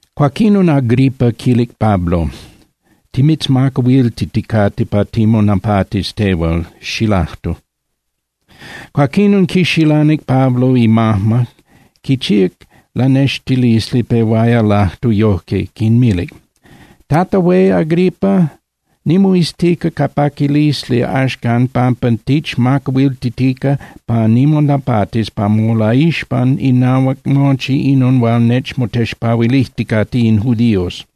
Cuaquinon Agripa quilic Pablo: —Timitzmacahuiltiticate pa timonapatis tehual, xilajtu. Cuaquinon quixilanic Pablo imajma, quichíac lanextilisli, pehuaya lajtu yojque, quinmilic: —Tata Hué Agripa, nimoiztica ca paquilisli axcan pampa tichmacahuiltitica pa nimonapatis pa molaixpan inahuac mochi inon hual nechmotexpahuilijticate in judíos.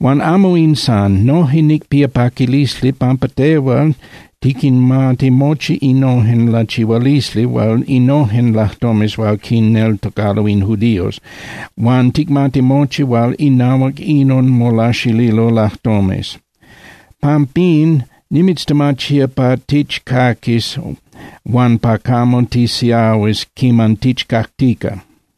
Huan amo in san. Noje nicpía paquilisli pampa tehual tiquinmati mochi innojen lachihualisli huan innojen lajtomes hual quinneltocalo in judíos, huan ticmati mochi hual inahuac inon molaxililo lajtomes. Pampín nimitztemachía pa tichcaquis huan pa camo tisiahuis quiman tichcactica.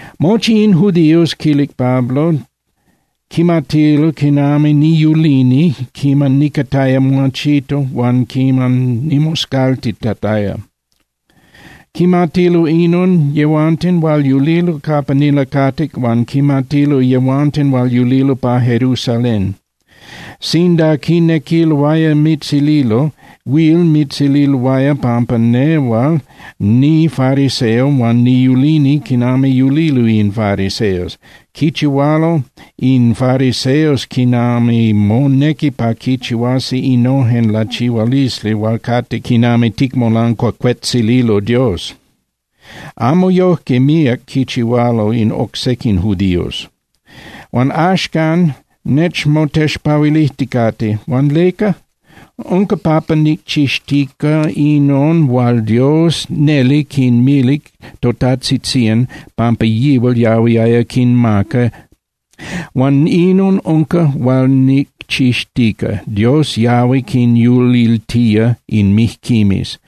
’Moxtin in judíos —quilic Pablo—, quimatilo quinami niyulini quiman nicataya muachito huan quiman nimoscaltitataya. Quimatilo inon yehuanten hual yulilo capa nilacatic huan quimatilo yehuanten hual yulilo pa Jerusalén. Sinda quinequiloaya mitzililo, huil mitzililoaya pampa nehual nifariseo huan niyulini quinami yulilo in fariseos. Quichihualo in fariseos quinami monequi pa quichihuasi innojen lachihualisli hual cate quinami ticmolancuacuetzililo Dios. Amo yojque míac quichihualo in oc sequin judíos. Huan axcan nechmotexpahuilijticate. Huan ¿leca? Unca pampa nicchixtica inon hual Dios neli quinmilic totajtzitzían pampa yihual yahuiaya quinmaca. Huan inon unca hual nicchixtica, Dios yahui quinyuliltía in mijquimes.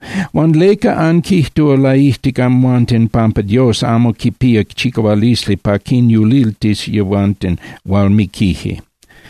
Huan ¿leca anquijtúa laijtic amhuanten pampa Dios amo quipía chicahualisli pa quinyuliltis yehuanten hual miquije?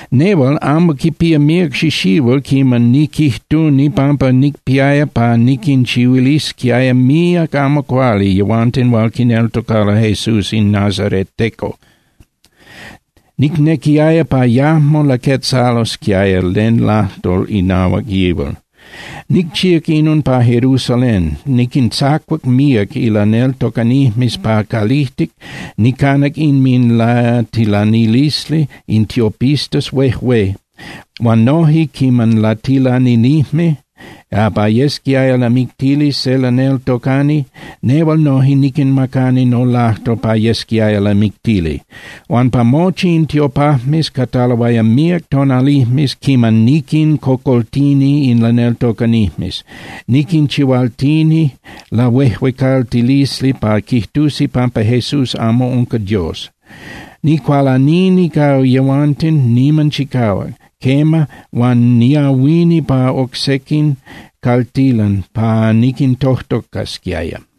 ’Nehual, amo quipía míac xixihuil quiman niquijtuni pampa nicpiaya pa niquinchihuilisquiaya míac amo cuali yehuanten hual quineltocalo Jesús in nazareteco. Nicnequiaya pa yajmo laquetzalosquiaya len lajtol inahuac yihual. Nicchíac inon pa Jerusalén. Niquintzacuac míac ilaneltocanijmes pa calijtic, nicanac inminlatilanilisli in tiopistas huejué. Huan noje, quiman latilaninijme pa yesquiaya lamictili se laneltocani, nehual noje niquinmacani nolajtol pa yesquiaya lamictili. Huan pa mochi in tiopajmes cataloaya míac tonalijmes quiman niquincocoltini in laneltocanijmes, niquinchihualtini lahuejuecaltilisli pa quijtusi pampa Jesús amo unca Dios. Nicualanini ca yehuanten niman chicahuac, quema, huan niahuini pa oc sequin caltilan pa niquintojtocasquiaya.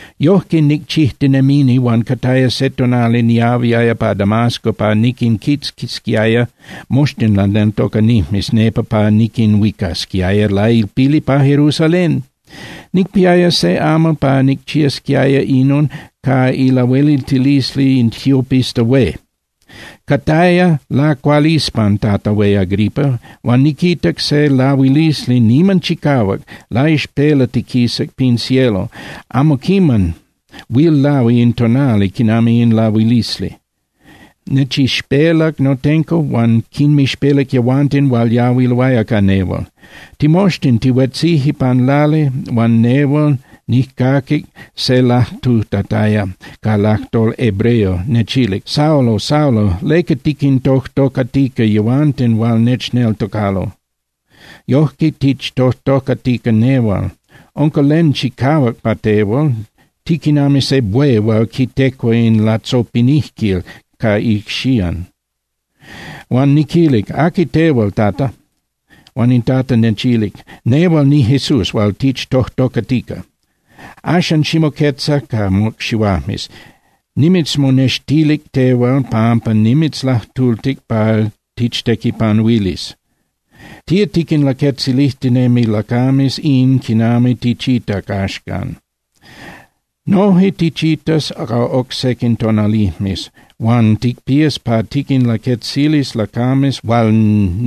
’Yojque nicchijtinemini huan cataya se tonali niahuiaya pa Damasco pa niquinquitzquisquiaya moxtin laneltocanijmes nepa pa niquinhuicasquiaya lailpili pa Jerusalén. Nicpiaya se amal pa nicchiasquiaya inon ca ilahueliltilisli in tiopista hué. Cataya lacualispan, Tata Hué Agripa, huan niquitac se lahuilisli niman chicahuac, laixpelatiquisac pin cielo. Amo quiman huil lahui in tonali quinami in lahuilisli. Nechixpelac notenco huan quinmixpelac yehuanten hual yahuiloaya ca nehual. Timoxtin tihuetzije pan lali huan nehual nijcaquic se lajtutataya ca lajtol hebreo, nechilic: “Saulo, Saulo, ¿leca tiquintojtocatica yehuanten hual nechneltocalo? Yojque tichtojtocatica nehual. Unca len chicahuac pa tehual. Tiquinami se buey hual quitecua in latzopinijquil ca icxían.” Huan niquilic: “¿Aqui tehual, Tata?” Huan in Tata nechilic: “Nehual niJesús hual tichtojtocatica. Axan, ximoquetza ca mocxihuajmes. Nimitzmonextilic tehual pampa nimitzlajtultic pa tichtequipanuilis. Tía tiquinlaquetzilijtinemi lacames in quinami tichitac axcan. Noje tichitas ca oc sequin tonalijmes huan ticpías pa tiquinlaquetzilis lacames hual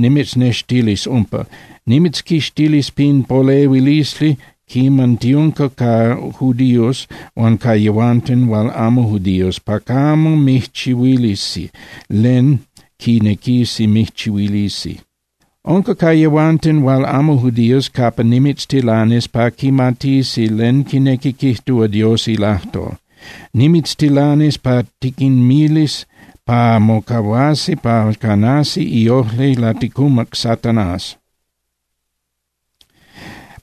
nimitznextilis umpa. Nimitzquixtilis pin polehuilisli quiman tiunca ca judíos huan ca yehuanten hual amo judíos pa camo mijchihuilisi len quinequisi mijchihuilisi. Unca ca yehuanten hual amo judíos capa nimitztilanis pa quimatisi len quinequi quijtúa Dios ilajtol. Nimitztilanis pa tiquinmilis pa mocahuasi pa canasi iojli laticumac Satanás,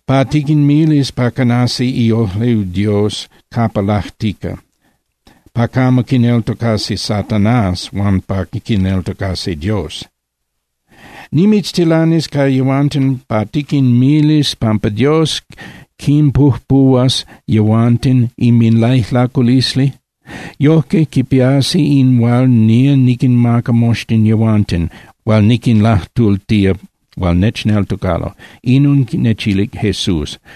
pa tiquinmilis pa canasi iojli Dios capa lajtica, pa camo quineltocasi Satanás huan pa quineltocasi Dios. Nimitztilanis ca yehuanten pa tiquinmilis pampa Dios quinpujpuhuas yehuanten inminlaijlaculisli. Yojque quipiasi in hual nía niquinmaca moxtin yehuanten hual niquinlajtultía, hual nechneltocalo.” Inon nechilic Jesús.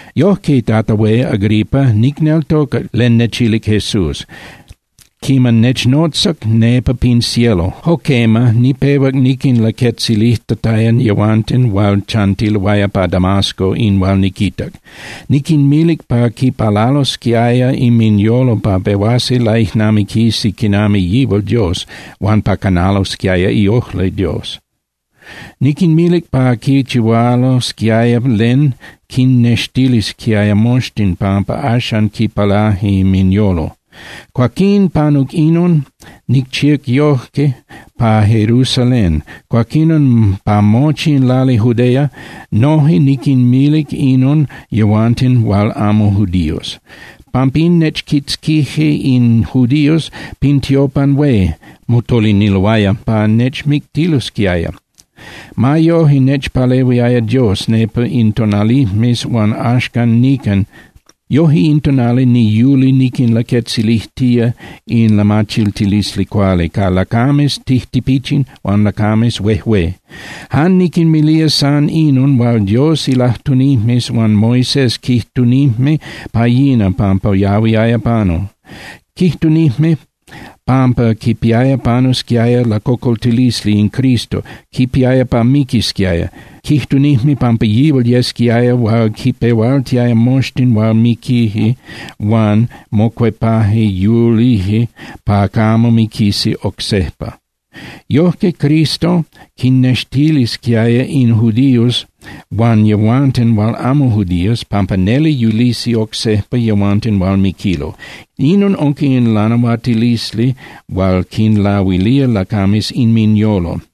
’Yojque, Tata Hué Agripa, nicneltocac len nechilic Jesús quiman nechnotzac nepa pin cielo. Jo quema, nipehuac niquinlaquetzilijtataya yehuanten hual chantiloaya pa Damasco in hual niquitac. Niquinmilic pa quipalalosquiaya inminyolo pa pehuasi laijnamiquisi quinami yihual Dios huan pa canalosquiaya iojli Dios. Niquinmilic pa quichihualosquiaya len quinnextilisquiaya moxtin pampa axan quipalaje inminyolo. Cuaquín, panuc inon, nicchíac yojque pa Jerusalén, cuaquinon pa mochi in lali Judea. Noje niquinmilic inon yehuanten hual amo judíos. Pampín nechquitzquije in judíos pin tiopan hué, motoliniloaya pa nechmictilosquiaya. Ma yoje, nechpalehuiaya Dios nepa in tonalijmes huan axan nican. Yoje in tonali niyuli niquinlaquetzilijtía in lamachiltilisli cuali ca lacames tijtipichin huan lacames huejué. Jan niquinmilía san inon hual Dios ilajtunijmes huan Moisés quijtunijme pa yina pampa yahuiaya panu. Quijtunijme pampa quipiaya panusquiaya lacocoltilisli in Cristo, quipiaya pa miquisquiaya. Quijtunijme pampa yihual yesquiaya hual quipehualtiaya moxtin hual miquije huan mocuepaje yulije pa camo miquisi oc sejpa. Yojque Cristo quinnextilisquiaya in judíos huan yehuanten hual amo judíos pampa neli yulisi oc sejpa yehuanten hual miquilo. Inon unca in lanahuatilisli hual quinlahuilía lacames inminyolo.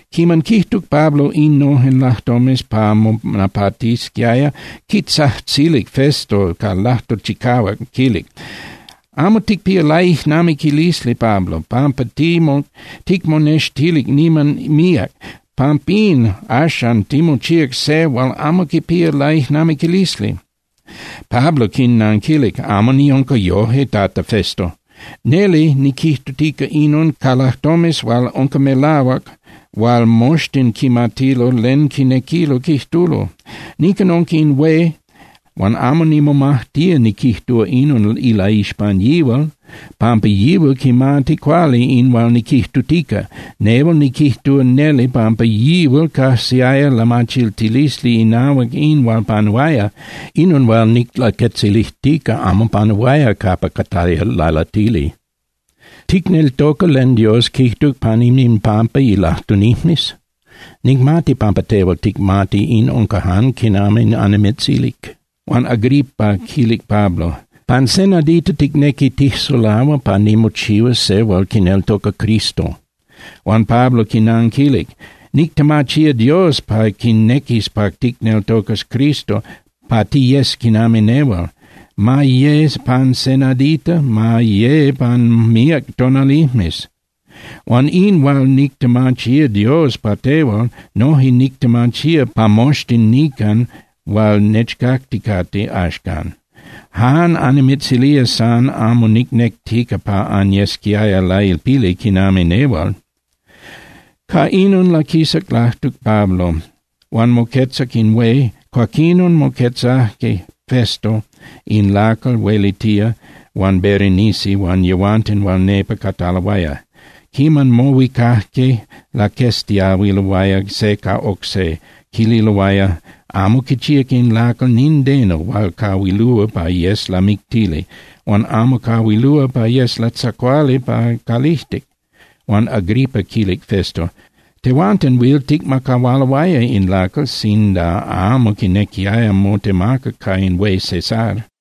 Quiman quijtuc Pablo innojen lajtomes pa monapatisquiaya, quitzajtzilic Festo ca lajtol chicahuac, quilic: —¡Amo ticpía laijnamiquilisli, Pablo, pampa ticmonextilic niman míac! ¡Pampín axan timochíac se hual amo quipía laijnamiquilisli! Pablo quinanquilic: —Amo niunca yojque, Tata Festo. Neli niquijtutica inon ca lajtomes hual unca melahuac hual moxtin quimatilo len quinequilo quijtulo. Nican unca in hué huan amo nimomajtía niquijtúa inon ilaixpan yihual, pampa yihual quimati cuali in hual niquijtutica. Nehual niquijtúa neli pampa yihual cajsiaya lamachiltilisli inahuac in hual panuaya. Inon hual niclaquetzilijtica amo panuaya capa cataya lalatili. Tehual, Tata Hué Agripa, ¿ticneltoca len Dios quijtuc pan inminpampa ilajtunijmes? Nicmati pampa tehual ticmati in unca jan quinami annimitzilic. Huan Agripa quilic Pablo: —Pan se nadita ticnequi tijsulahua pa nimochihuas se hual quineltoca Cristo. Huan Pablo quinanquilic: —Nictemachía Dios pa quinequis pa ticneltocas Cristo, pa tiyes quinami nehual, ma ye pan se nadita, ma ye pan míac tonalijmes. Huan in hual nictemachía Dios pa tehual, noje nictemachía pa moxtin nican hual nechcacticate axcan. Jan annimitzilía san amo nicnectica pa anyesquiaya lailpili quinami nehual. Ca inon laquisac lajtuc Pablo, huan moquetzac in hué, cuaquinon moquetzajque Festo in lacal huelitía huan Berenice huan yehuanten hual nepa cataloaya. Quiman mohuicajque, laqueztiahuiloaya se ca oc se, quililoaya: —Amo quichíac in lacal nindeno hual cahuilúa pa yes lamictili, huan amo cahuilúa pa yes latzacuali pa calijtic. Huan Agripa quilic Festo: —Tehuanten huil ticmacahualoaya in lacal sinda amo quinequiaya motemaca ca in hué Cesar.